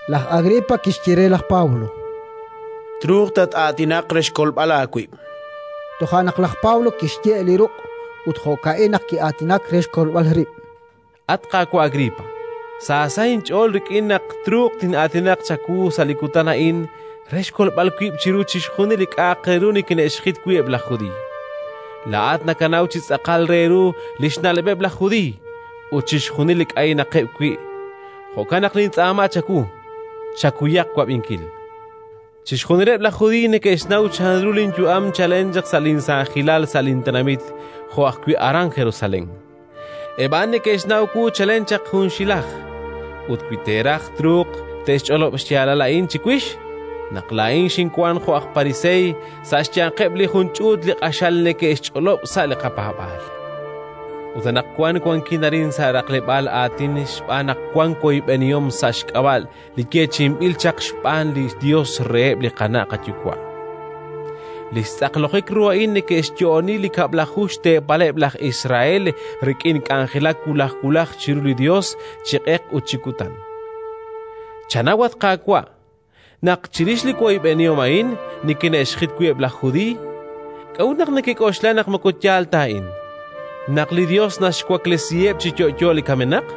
Laj Agripa kixye re laj Pablo: —Truuq tat-aatinaq re xkolb'al aawib'. Toja' naq laj Pablo kixye' li ruq', ut jo'ka'in naq ki'aatinak re xkolb'al rib': “At qaawa' Agripa, sa sa' inch'ool rik'in naq truuq tin'aatinaq chawu sa' li kutan a'in re xkolb'al wib' chiru chixjunil li k'a'aq re ru nikine'xjit wi' eb' laj Judiiy. Laa'at nakanaw chi tz'aqal re ru li xna'leb'eb' laj Judiiy ut chixjunil li k'aynaqeb' wi'. Jo'kan naq nintz'aama chawu, chakuyaq wab'inkil. “Chixjunileb' laj Judiiy neke'xnaw chanru linyu'am chalen chaq sa' linsaajilal, sa' lintenamit jo'ajwi' aran Jerusalén. Eb' a'an neke'xnaw wu chalen chaq junxilaj ut, wi te'raj, truuq te'xch'olob' xyaalal a'in chiwix: naq laa'in kinwank jo' aj Pariseey, sa' xyanqeb' li jun ch'uut li q'axal neke'xk'e xch'ool sa' li qapaab'aal. Ut anaqwan wankin arin sa' raqleb'aal aatin xb'aan naq wank woyb'enihom sa' xk'ab'a' li yeechi'inb'il chaq xb'aan li Yos reheb' li qana' qayuwa'. Li xtz'aqlojik ru a'in neke'xyo'oni li xkab'laju teepaleb' laj Israel; jo'kan naq kaw neke'k'anjelak chiru li Yos chi q'eq ut chi kutan. Chanaw, at qaawa', naq chirix li woyb'enihom a'in nikine'xjit eb' laj Judiiy. K'a'ut naq nekek'oxla naq moko yaal ta a'in: naq li Yos naxwaklesiheb' chi yo'yo li kamenaq?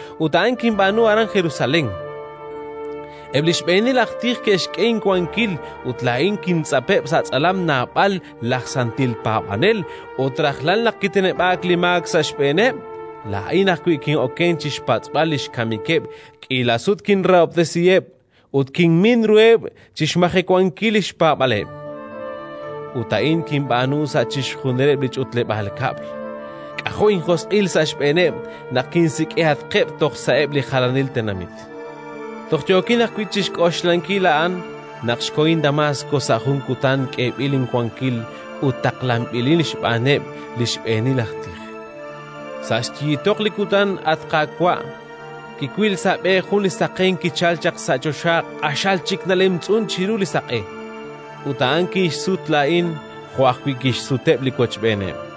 Ut a'an kinb'aanu aran Jerusalén: eb' li xb'eenil aj tij ke'xk'e inwankil ut laa'in kintz'apeb' sa' tz'alam naab'al laj santil paab'anel, ut rajlal naq kiteneb'aak li kamk sa' xb'eeneb', laa'in ajwi' kin'okenk chi xpatz'b'al li xkamikeb'. K'iila sut kinrahob'tesiheb' ut kinmin ruheb' chi xmajewankil li xpaab'aaleb'. Ut a'in kinb'aanu sa' chixjunileb' li ch'utleb'aal kab'l; k'ajo' linjosq'il sa' xb'eeneb' naq kinsik'ihatqeb' toj sa'eb' li jalanil tenamit. “Toj yookin ajwi' chi xk'oxlankil a'an naq xkohin Damaask sa' jun kutan, k'eeb'il inwankil ut taqlanb'ilin xb'aaneb' li xb'eenil aj tij. Sa' xyiitoq li kutan, at qaawa', kiwil sa' b'e jun li saqenk kichalk chaq sa' choxa, q'axal chik nalemtz'unk chiru li saq'e; ut a'an kinxsut laa'in jo' ajwi' kixsuteb' li wochb'eeneb'.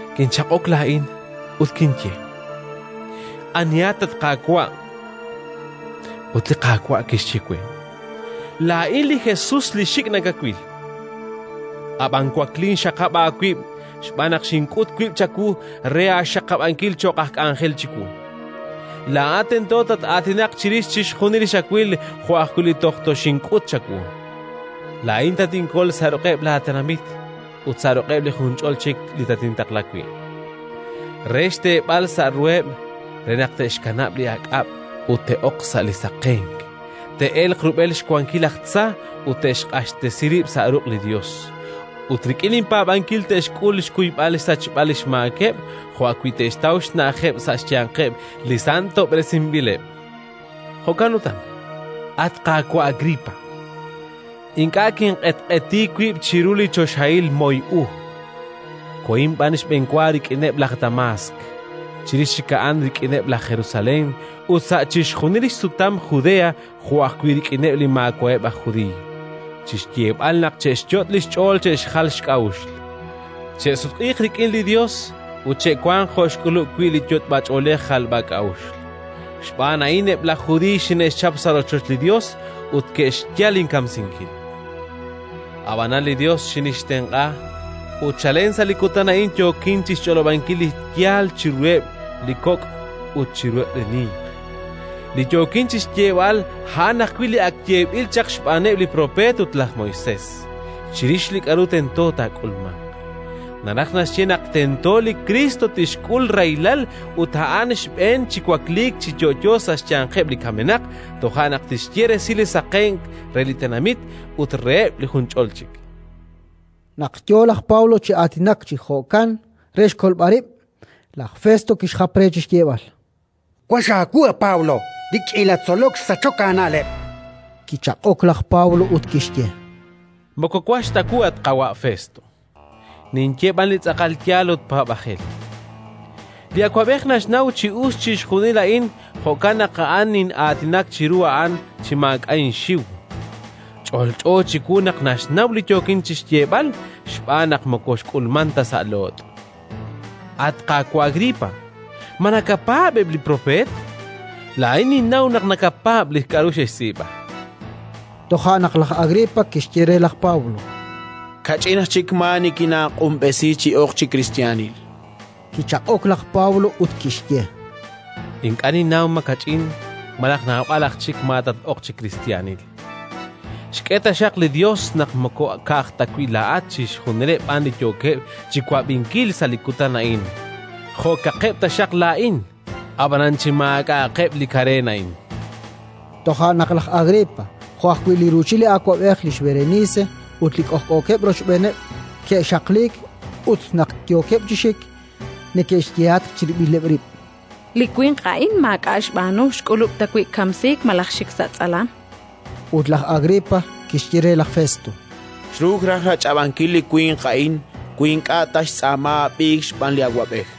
Kinchaq'ok laa'in ut kinye: «Anihat, at Qaawa'?». Ut li Qaawa' kixye we: «Laa'in li Jesus li xik' nakawil. Ab'an waklin, xaqab' aawib' xb'aan naq xink'ut wib' chawu re aaxaqab'ankil cho'q aj k'anjel chiwu: laa'at tento tataatinaq chirix chixjunil li xawil jo' ajwi' li toj toxink'ut chawu. Laa'in tatinkol sa' ruq'eb' laatenamit ut sa' ruq'eb' li junch'ol chik li tatintaqla wi' re xteeb'al xsa' ruheb', re naq te'xkanab' li aak'ab' ut te'ok sa' li saqenk, te'elq rub'el xwankil laj tza ut te'xq'axtesi rib' sa' ruq' li Yos; ut rik'in inpaab'ankil te'xk'ul xkuyb'al xsachb'al li xmaakeb' jo' ajwi' te'xtaw xna'ajeb' sa' xyanqeb' li santob'resinb'ileb'». “Jo'kan utan, at qaawa' Agripa, ink'a' kinq'etq'eti wib' chiru li choxahil moy u, kohin b'an xb'enwa rik'ineb' laj Damaask; chirix chik a'an rik'ineb' laj Jerusalén ut sa' chixjunil xsutam Judea jo' ajwi' rik'ineb' li maawa'eb' aj Judiiy, chi xyeeb'al naq che'xyot' xch'ool che'xjal xk'a'uxl. Xinye ajwi' reheb' naq che'sutq'iiq rik'in li Yos ut che'wanq jo' xk'ulub' wi' li yot'b'ach'oolej jalb'ak'a'uxl. Xb'aan a'in eb' laj Judiiy xine'xchap sa' rochoch li Yos ut xe'xyal inkamsinkil. Ab'anan li Yos xinxtenq'a, ut chalen toj sa' li kutan a'in yookin chi xch'olob'ankil li yaal chiruheb' li kok' ut chiruheb' li ninq. Li yookin chi xyeeb'al, a'an ajwi' li ak yeeb'il chaq xb'aaneb' li propeet ut laj Moisés, chirix li k'aru tento taak'ulmanq: naraj naxye naq tento li Kriist tixk'ul rahilal ut a'anaq xb'een chi wakliik chi yo'yo sa' xyanqeb' li kamenaq, toja' naq tixye resil li saqenk re li xtenamit ut reheb' li junch'ol chik”. Naq yo laj Pablo chi aatinak chi jo'kan re xkolb'al rib', laj Festo kixjap re chi xyeeb'al: —Wax aawu, a Pablo. Li k'iila tzolok xsachok aana'leb'. Kichaq'ok laj Pablo ut kixye: —Moko wax ta wu, at qaawa' Festo, ninye b'an li tz'aqal yaal ut paab'ajel. Li awab'ej naxnaw chi us chixjunil a'in; jo'kan naq nin'aatinak chiru a'an chi maak'a' inxiw. Ch'olch'o chiwu naq naxnaw li yookin chi xyeeb'al, xb'aan naq moko xk'ulmank ta sa' loot'. At qaawa' Agripa, ma nakapaab' eb' li propeet? Laa'in ninnaw naq nakapaab' li k'aru ke'xtz'iib'a. Toja' naq laj Agripa kixye re laj Pablo: —Kach'in aj chik maa nikinaaq'unb'esi chi ok chi kristiyanil. Kichaq'ok laj Pablo ut kixye: —Ink'a' ninnaw ma kach'in malaj naab'al aj chik maa tat-ok chi kristiyanil. Xk'e taxaq li Yos naq moko ka'aj ta wi' laa'at, chixjunileb' b'an li yookeb' chi wab'inkil sa' li kutan a'in jo'kaqeb' taxaq laa'in, ab'anan chi maak'a'aqeb' li kareen a'in. Toja' naq laj Agripa jo' ajwi' li ruuchil li awab'ej, lix Berenice ut li k'ojk'ookeb' rochb'eeneb' ke'xaqliik ut, naq yookeb' chi xik, neke'xyehatq chirib'ileb' rib': —Li winq a'in maak'a' xb'aanu xk'ulub' ta wi' kamsiik malaj xik sa' tz'alam. Ut laj Agripa kixye re laj Festo: —Xruuk raj rach'ab'ankil li winq a'in wi ink'a' ta xtz'aama ab'iik xb'aan li awab'ej.